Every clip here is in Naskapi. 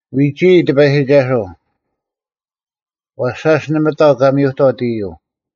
ᐎᒋᐃ, ᑎᐸᔨᒋᒐᓱᐤ; ᐛᔅ ᓴᔅ ᓇᒪ ᑕᐤ ᑲ ᒥᔪᑥᑦ ᐃᔪᐤ;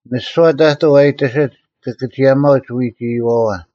ᒥᓯᐛ ᑕᑐᐤ ᐊ ᐃᑎᓯᒡ ᑭᑭᒋᔭᒪᐅᒡ ᐎᒋ ᐃᔪᐛᐛ;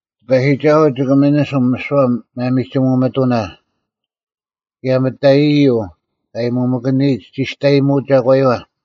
ᑎᐸᔨᒋᒐᓱᐤ ᒋᑭ ᒥᓂᓯᒻ ᒥᓯᐛ ᒪᒥᒋᒧ ᒥᑐᓇ, ᑭᔭ ᒥᑕᔨᔨᔪᐤ ᑲ ᐊᔭᔨᒧᒥᑭᓂᔨᒡ ᒋᔅᑕᔨᒧᐤ ᒐᒂᔪᐛ᙮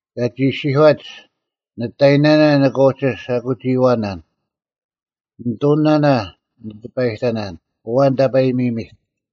ᑲᒋ ᐃᔅᒋᔄᒡ, “ᓂᑕᔨᔨᓇᓇ ᓂᑭ ᐅᒋ ᓴᐧᑯᒋᐃᐛᓇᓐ; ᓂᑐᓂᓇᓇ ᓂ ᑎᐸᔨᑕᓇᓐ: ᐊᐛᓐ ᑕᐸᔨᒥᔨᒥᑦ?”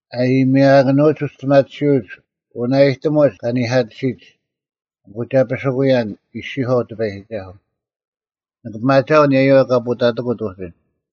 “ᐊ ᐊᔨᒥᐊᑭᓄᐎᒡ ᐅᒋᔅᑎᒪᒋᓯᐅᒡ, ᐅᓇᐃᑎᒧᒡ ᑲ ᓇᐧᑲᑎᓯᒡ, ᐊᑯ ᒐ ᐱᓯᑯᔭᓐ,” ᐃᔅᒋᔄᐤ ᑎᐸᔨᒋᒐᓱᐤ; “ᓂᑭ ᐱᒪᒋᐊᐤ ᐊᓂᔭᔪᐛ ᑲ ᐳᑕᑎᑯᑦ ᐅᒋ᙮”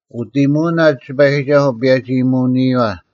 ᐅᑦ ᐃᔨᒧᐅᓇ ᑎᐸᔨᒋᒐᓱᐤ ᐸᔭᒋ-ᐃᔨᒧᐅᓂᔪᐛ;